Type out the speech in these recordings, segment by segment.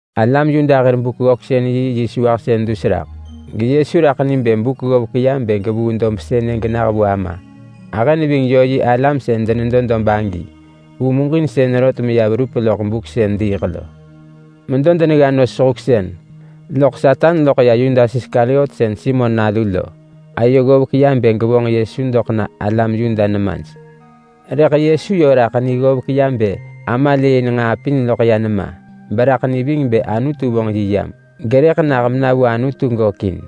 Alam Yuda hir Buk-vabuung-ggöksën-yi yö nahën geYesu raḳ ni bë buk dus raḳ ggovek ya bë gevuu dob sënë genah vu Ama. Ahë neving yö yi alam sën denedo dob sënë vu muġinsën rot meya verup loḳ buk sën diiḳ lo. Medo denegga nos sehuksën loḳ Satan loḳ ya Yudas Iskariot sën Simon nalu lo ayo ggovek ya bë gevonġ Yesu doḳ na alam Yuda nemaj. Rëḳ Yesu yö raḳ ni ggovek ya bë Ama lëëin nġaa pin loḳ ya nema, beraḳ ni ving bë Anutu vonġ yi yam, gerëḳ nah mena vu Anutu gökin.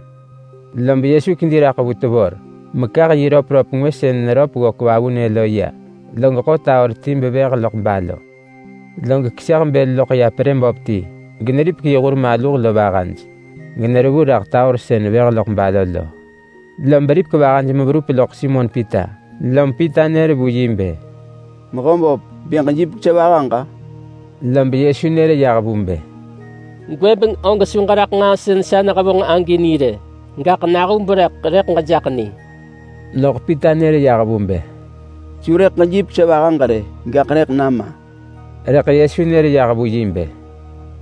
Lom Yesu kedi raḳ vu tevor mekah yi röpröp ngwë sën neröp ggök vavunë lo ya, log ḳo taor ti bevëh neggëp balo, log keseh bël loḳ ya perë böp ti betunġ ya, generipek yi hur maluh vahaj, generevu raḳ taor sën vëh neggëp balo lo. Lob neripek vahaj meverup loḳ Simon Pita. Lom Pita nër vu yi bë, “Mehöböp, bë ġejipek sa vahaġ-a?” Lob Yesu nër yah vu bë, “Gwëbeng og su ġeraḳ nġaa sën sa nehevonġ agi ni rë. Gaḳ nahub rëḳ rëḳ gejaḳ ni.” Loḳ Pita nër yah vu bë, “Su rëḳ ġejipek sa vahaġ rë! Gaḳ rëḳ nama!” Rëḳ Yesu nër yah vu yi bë,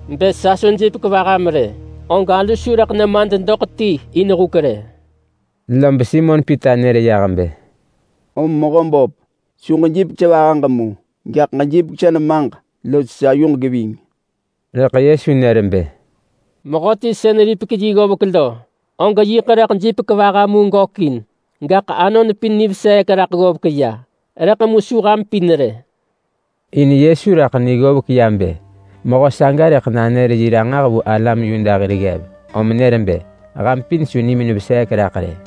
“Bë sa su jipek vaham rë, og alu su rëḳ nemad doḳ ti in huk rë.” Lob Simon Pita nër yah bë, “Om Mehöböp, su ġejipek sa vahaġ mu, gaḳ ġejipek sa nemaġ los sa yuġ geving!” Rëḳ Yesu nër bë, “Mehöti sën ripek yi ggovek lo, og yiḳ rëḳ jipek vaha mu gökin, gaḳ anon pin niveseek raḳ ggovek ya, rëḳ mu su ham pin rë.” In Yesu raḳ ni ggovek ya bë mehö saga rëḳ nanër yi ranġah vu alam Yuda hir ggev, lom mëm nër bë, “Ham pin su nimin veseek raḳ rë!”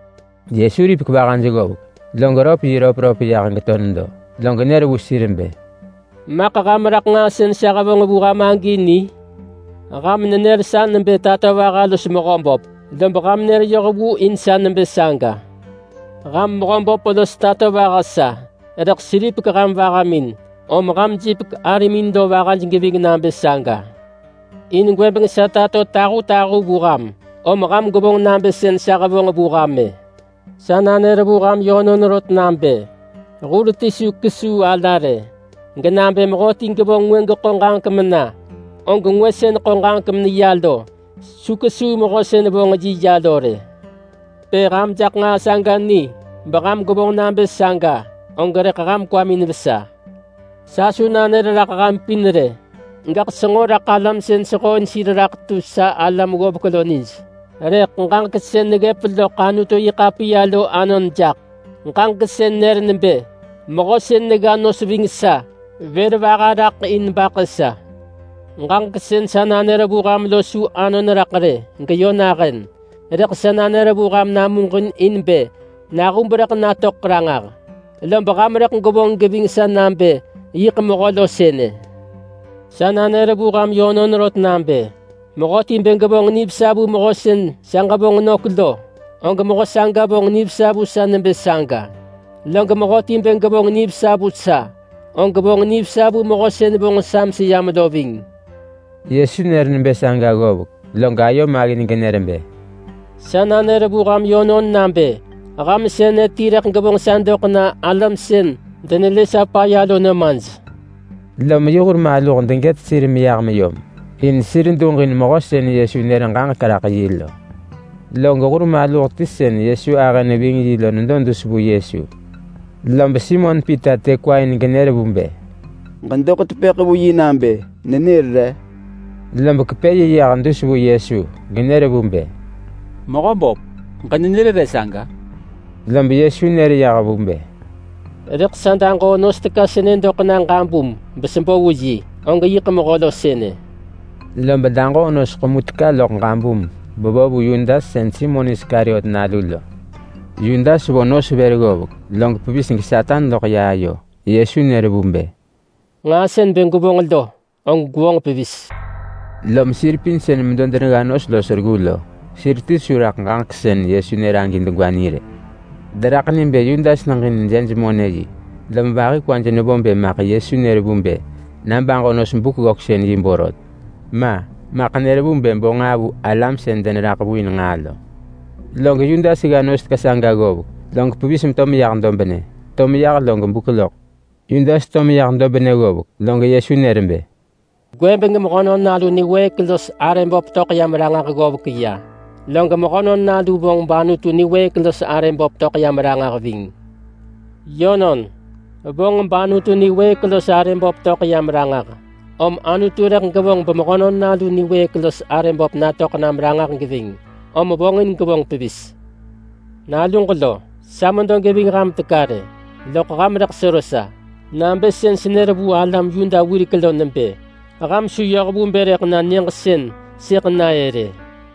Yesu ripek vahaj ggovek, log röp yi röpröp yah geto nedo. Log nër vu sir bë, “Maḳ ham raḳ nġaa sën sa hevonġ vu ham-ë ni? Ham nenër sa nebë Tatovaha los Mehöböp, lob ham nër yoh vu in sa nebë saga. Ham Mehöböp los Tatovaha sa, rëḳ seripek ham vahamin. Om ham jipek arimin lo vahaj geving nabë saga. In gwëbeng sa tato tahutahu vu ham, om ham gwevonġ nabë sën sa hevonġ vu ham-ë. Sa nanër vu ham yönon rot nabë: Hur ti su kesuu ala rë. Genabë mehöti gevonġ ngwë geḳo ġaġek mena, og ngwë sën ḳo ġaġek meneya lo, su kesuu mehö sën vonġ yi ya lo rë. Bë ham jaḳ nġaa saga ni, beham gwevonġ nabë saga, og rëḳ ham kwamin vesa. Sa su nanër raḳ ham pin rë, gaḳ senġo raḳ alam sën sehooin sir raḳ tu sa alam ggovek lo nij. Rëḳ ġaġek sën neggëp loḳ Anutu-yi-ḳapiya lo anon jaḳ. Ġaġek sën nër nebë: Mehö sën negga nos ving sa, vër vaha raḳ in baḳë sa. Ġaġek sën sa nanër vu ham lo su anon raḳ rë geyö nahën, rëḳ sa nanër vu ham namuġin in bë nahub rëḳ natöḳ ranġah, lob ham rëḳ gwevonġ geving sa nabë yiḳ Mehö lo sënë. Sa nanër vu ham yönon rot nabë: Mehöti bë gevonġ nivesa vu mehö sën sa ġevonġ nök lo, og mehö saga vonġ nivesa vu sa nebë saga. Log mehöti bë gevonġ nivesa vu sa, og vonġ nivesa vu Mehö sën vonġ sa meseyam lo ving.” Yesu nër nebë saga ggovek, log ayo maggin genër bë, “Sa nanër vu ham yönon nabë ham sënë ti rëḳ gevonġ sa doḳ na alam sën denelë sa paya lo nemaj.” Lom yi hur maluh degët sir meyah meyom in sir duġin mehö sën Yesu nër ġaġek raḳ yi lo. Log hur maluh ti sën Yesu ahë neving yi lo nedo dus vu Yesu. Lob Simon Pita të kwa in genër vu bë, “Ġedoḳ tepëḳ vu yi nabë nenër re!” Lob kepë yi yah dus vu Yesu genër vu bë, “Mehöböp, ġenenër re saga?” Lob Yesu nër yah vu bë, “Rëḳ sa daġoo nos teka sënë doḳ ġabum besebo vu yi. Og yiḳ mehö lo sënë.” Lob daġoo nos ḳemu teka loḳ ġabum bevo vu Yudas sën Simon Iskariot nalu. Yudas vo nos vër ggovek log pevis geSatan loḳ ya ayo. Yesu nër vu bë, “Nġaa sën bë gwevonġ lo, og gwevonġ pevis.” Lom sir pin sën medo denegga nos los reggu saga lo sir ti su raḳ ġaġek sën Yesu nër agi degwa ni rë. Deraḳ ni bë Yudas neġin jej-monë-yi, lom vahi kwaj nevo bë maḳ Yesu nër vu bë na baġo nos-buk-vabuung-yi borot. Ma, maḳ nër vu bë bo nġaa vu alam sën deneraḳ vu in nġaa lo. Log Yudas gga nos teka saga ggovek, log pevis meto meyah dobnë. To meyah log buk loḳ. Yudas to meyah dobnë ggovek, log Yesu nër bë, “Gwëbeng Mehönon Nalu niwëëk los arë böp töḳ yam ranġah ggovek ya, log Mehönon Nalu vonġ bAnutu niwëëk los arë böp töḳ yam ranġah ving. Yönon, vonġ bAnutu niwëëk los arë böp töḳ yam ranġah, om Anutu rëḳ gevonġ beMehönon Nalu niwëëk los arë böp natöḳ nam ranġah geving, om vonġin gevonġ pevis. Naluġ lo! Sa medo geving ham teka rë, loḳ ham rëḳ sero sa nabë sën senër vu alam Yuda wirek lo nebë, ‘Ham su yoh vu bë rëḳ na nyëġ sën sëḳ na-ë rë.’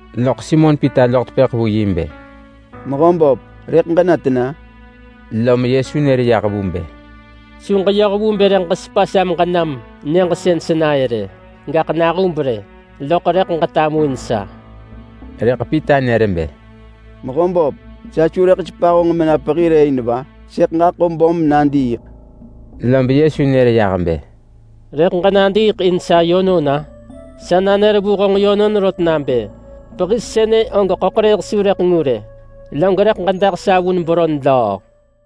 Loḳ Simon Pita loḳ tepëḳ vu yi bë, “Mehöböp, rëḳ ġena tena?” Lom Yesu nër yah vu bë, “Su ġeyoh vu bë rëḳ ġesepa sa meġenam nyëġ sën sena-ë rë. Gaḳ nahub rë, loḳ rëḳ ġetamuin sa.” Rëḳ Pita nër bë, “Mehöböp! Sa su rëḳ sepa honġ mena pehi rë in va? Sëḳ nadiiḳ in honġ!” Lob Yesu nër yah bë, “Rëḳ ġenadiiḳ in sa yönon-a? Sa nanër vu honġ yönon rot nabë pehi sënë og ḳöḳrëëh su rëḳ ngu rë, log rëḳ ġedah sa vun beron löö!”